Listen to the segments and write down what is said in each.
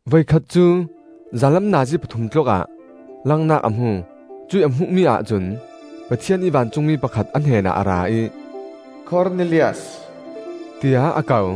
Voikhat cu zanlam nazi pathum tlukah langnak a hmu; cuih a hmuhmi ahcun Pathian ih vancungmi pakhat a hnenah a ra ih, “Kornelias!” tiah a ko.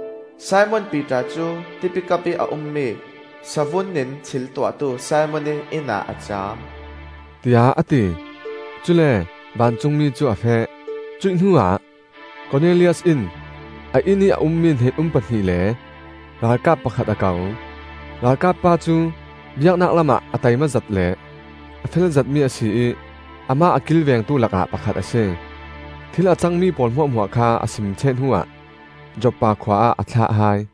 Simon Piter cu Tipi kapih a ummi savun in thil tuahtu Simon ih innah a caam,” tiah a ti. Cule vancungmi cu a feh; cuih hnuah Kornelias in a innih a ummi hnen-um pahnih le ralkap pakhat a ko. Ralkap pa cu biaknak lamah a taimazet le a felzetmi a si ih amah a kilvengtu lakah pakhat a si. Thil a cangmi pawl hmuahhmuah kha a sim ṭheh hnuah Joppa khua ah a thlah hai.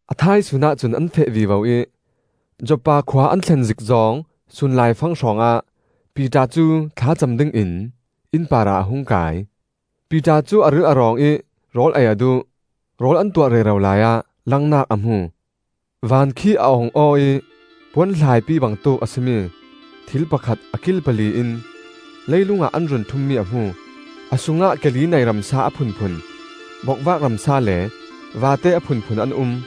A thaisun ahcun an feh vivo ih Joppa khua an thlen zik zawng sunlaifang hrawngah Piter cu thlacam dingin inn parah a hung kai. Piter cu a ril a rawng ih rawl ei a duh; rawl an tuah rero laiah langnak a hmu. Van khi a ong aw ih puan hlaipi bangtuk a si mi thil pakhat a kil pali in leilung ah an run ṭhummi a hmu. A sungah ke li nei ramsa a phunphun, bokvak ramsa le vate a phunphun an um.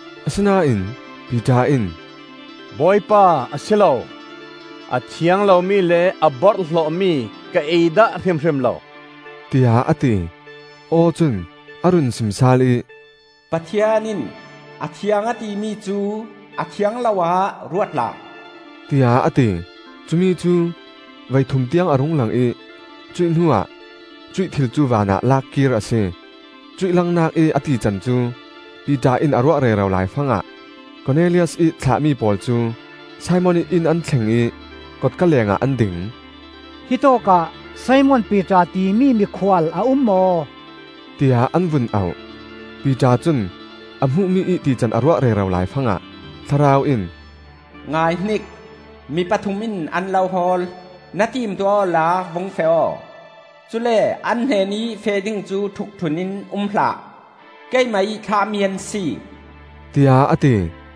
Asinain Piter in, “Bawipa, a si lo! A thiang lomi le a borhhlawhmi ka ei dah hrimhrim lo,” tiah a ti. Aw cun a run sim sal ih, “Pathian in a thiang a timi cu a thiang lo-ah ruat hlah,” tiah a ti. Cumi cu voithum tiang a rung lang ih cuih hnuah cuih thil cu vanah lak kir a si. Cuih langnak ih a tican cu Piter in a ruah rero laifangah Kornelias ih thlahmi pawl cu Simon ih inn an thleng ih kotka lengah an ding. “hittawk ah Simon Piter timi mikhual a um maw?” tiah an vun auh. Piter cun a hmuhmi ih tican a ruah rero laifangah Thlarau in, “Ngaihnik, mi pathum in an lo hawl! Na timtuah awla vung feh aw; cule an hnenih feh ding cu ṭhukṭhun in um hlah; keimah ih thlahmi an si,” tiah a ti.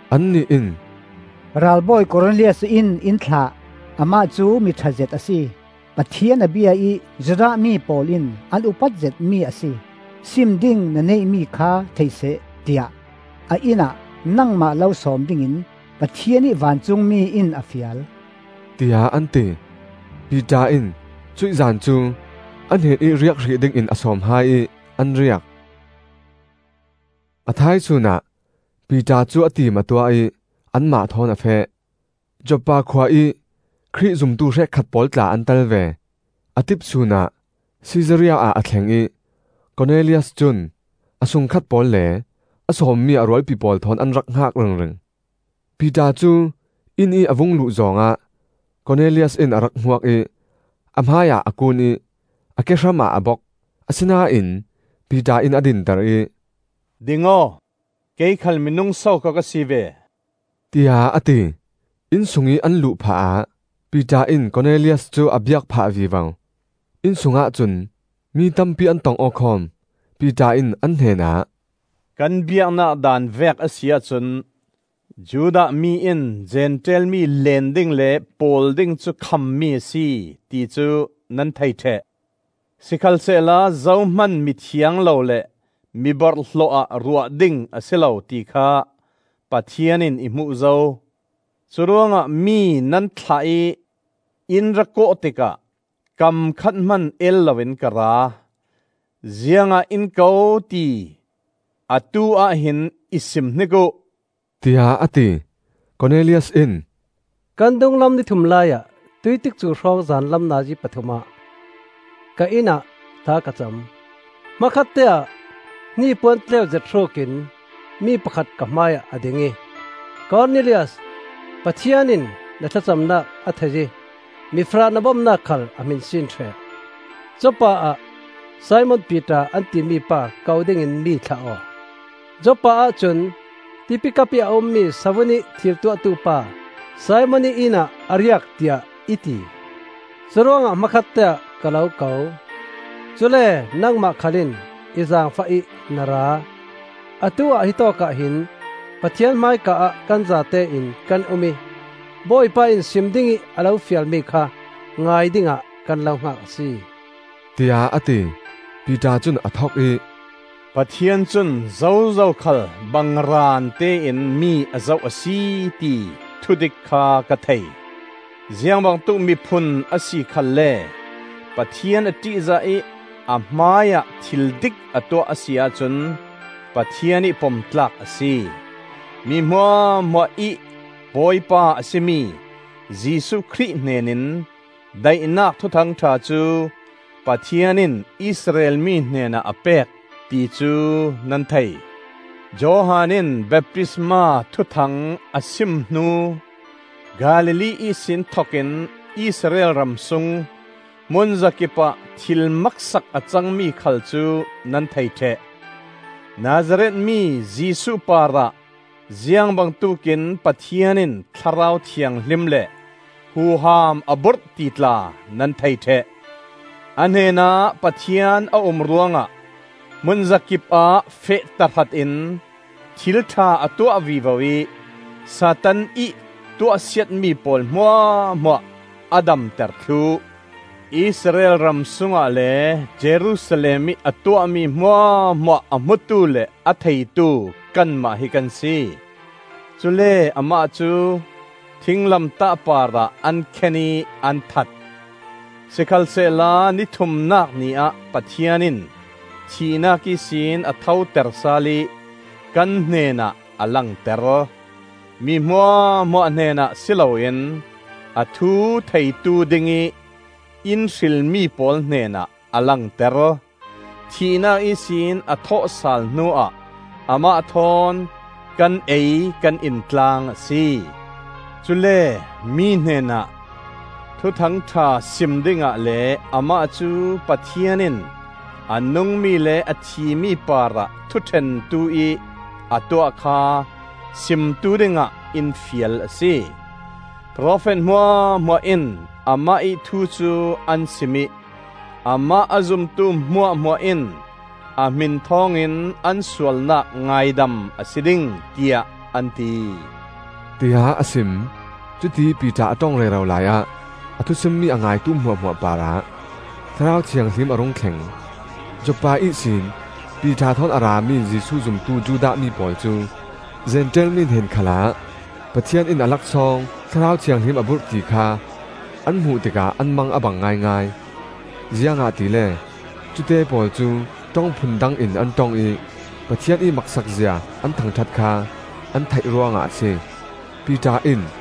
Annih in, “Ralbawi Kornelias in in thlah. Amah cu miṭhazet a si. Pathian a bia ih Judah mi pawl in an upat zetmi a si. Sim ding na neihmi kha thei seh tiah a inn ah nangmah lo sawm dingin Pathian ih vancungmi in a fial,” tiah an ti. Piter in cuih zan cu a hnenih riak hrih dingin a sawm hai ih an riak. A thaisun ah Piter cu a tim a tuah ih anmah thawn a feh; Joppa khua ih Khrih zumtu hrekkhat pawl tla an tel ve. A tipsun ah Sisaria ah a thleng ih Kornelias cun a sungkhat pawl le a sawmmi a rualpi pawl thawn an rak hngak ringring. Piter cu inn ih a vung luh zawng ah Kornelias in a rak hmuak ih a hmaiah a kuun ih a kehram ah a bok. Asinain Piter in a dinter ih, “Ding aw! Kei khal minung sokhaw ka si ve,” tiah a ti. Inn sungih an luh phahah Piter in Kornelias cu a biak phah vivo; inn sungah cun mi tampi an tong-aw khawm. Piter in an hnenah, “Kan biaknak daan vek a si ahcun Judah mi in Zentail mi leen ding le pawl ding cu khammi a si, ti cu nan thei ṭheh. Sikhalsehla zohman mi thiang lo le mi borhhlawh-ah ruah ding a si lo ti kha Pathian in i hmuh zo. Curuangah mi nan thlah ih in ra kawh tikah kam khat hman el loin ka ra. Ziangah in ko ti atu-ah hin i sim hnik uh,” tiah a ti. Kornelias in, “Kan dunglam ni thum laiah, tuih tikcu hrawng zanlam nazi pathum ah ka innah thla ka cam. Hmakhatte-ah hnipuan tleu zet hrukin mi pakhat ka hmaiah a ding ih, ‘Kornelias, Pathian in na thlacamnak a thei ih mifarah na bomnak khal a hminsin ṭheh. Joppa ah Simon Piter an timi pa ko dingin mi thlah aw. Joppa ahcun Tipi kapih a um mi savun in thil tuahtupa Simon ih inn ah a riak,’ tiah i ti. Curuangah hmakhatte-ah ka lo ko; cule nangmah khal in i zaangfah ih na ra. Atu-ah hitawk ah hin Pathian hmaika-ah kan zatein kan um ih Bawipa in sim dingih a lo fialmi kha ngai dingah kan lo hngak a si,” tiah a ti. Piter cun a thok ih, “Pathian cun zozo khal bangraan tein mi a zoh a si, ti thudik kha ka thei. Ziangbangtuk miphun a si khalle Pathian a ṭihzah ih a hmaiah thildik a tuah a si ahcun Pathian ih pom tlak a si. Mi hmuahhmuah ih Bawipa a si mi Jesuh Khrih hnenin daihnak Thuthang ṭha cu Pathian in Israel mi hnenah a pek, ti cu nan thei. Johan in baptisma thuthang a sim hnu Galilee ihsin thokin Israel ramsung hmunzakip ah thil maksak a cangmi khal cu nan thei ṭheh. Nazareth mi Jesuh parah ziang bangtuk in Pathian in Thlarau Thianghlim le huham a burh ti tla nan thei ṭheh. A hnenah Pathian a um ruangah hmunzakip ah feh tahrat in thil ṭha a tuah vivo ih Satan ih tuahsiatmi pawl hmuahhmuah a damter thluh. Israel ram sungah le Jerusalem ih a tuahmi hmuahhmuah a hmutu le a theitu kanmah hi kan si. Cule amah cu thinglamtah parah an khen ih an that. Sikhalsehla ni thumnak ni ah Pathian in thihnak ihsin a thoter sal ih kan hnenah a langter. Mi hmuahhmuah hnenah si loin a thu theitu dingih in hrilmi pawl hnenah a langter. Thihnak ihsin a thawhsal hnuah amah thawn kan ei kan in tlang a si. Cule mi hnenah Thuthang ṭha sim dingah le amah cu Pathian in a nungmi le a thimi parah thuṭhentu ih a tuah kha simtu dingah in fial a si. Profet hmuahhmuah in amah ih thu cu an sim ih amah a zumtu hmuahhmuah in a hmin thawngin an sualnak ngaidam a si ding, tiah an ti,” tiah a sim. Cutiih Piter a ṭong rero laiah a thusimmi a ngaitu hmuahhmuah parah Thlarau Thianghlim a rung thleng. Joppa ihsin Piter thawn a rami Jesuh zumtu Judah mi pawl cu Zentail mi hnen khalah Pathian in a laksawng Thlarau Thianghlim a burh ti kha an hmuh tikah an mang a bang ngaingai. Ziangahtile cute pawl cu ṭong phun dang in an ṭong ih Pathian ih maksak zia an thangṭhat kha an theih ruangah a si. Piter in,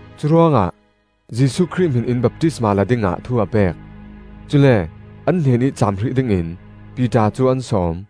Curuangah Jesuh Khrih hmin in baptisma lak dingah thu a pek. Cule an hnenih caam hrih dingin Piter cu an sawm.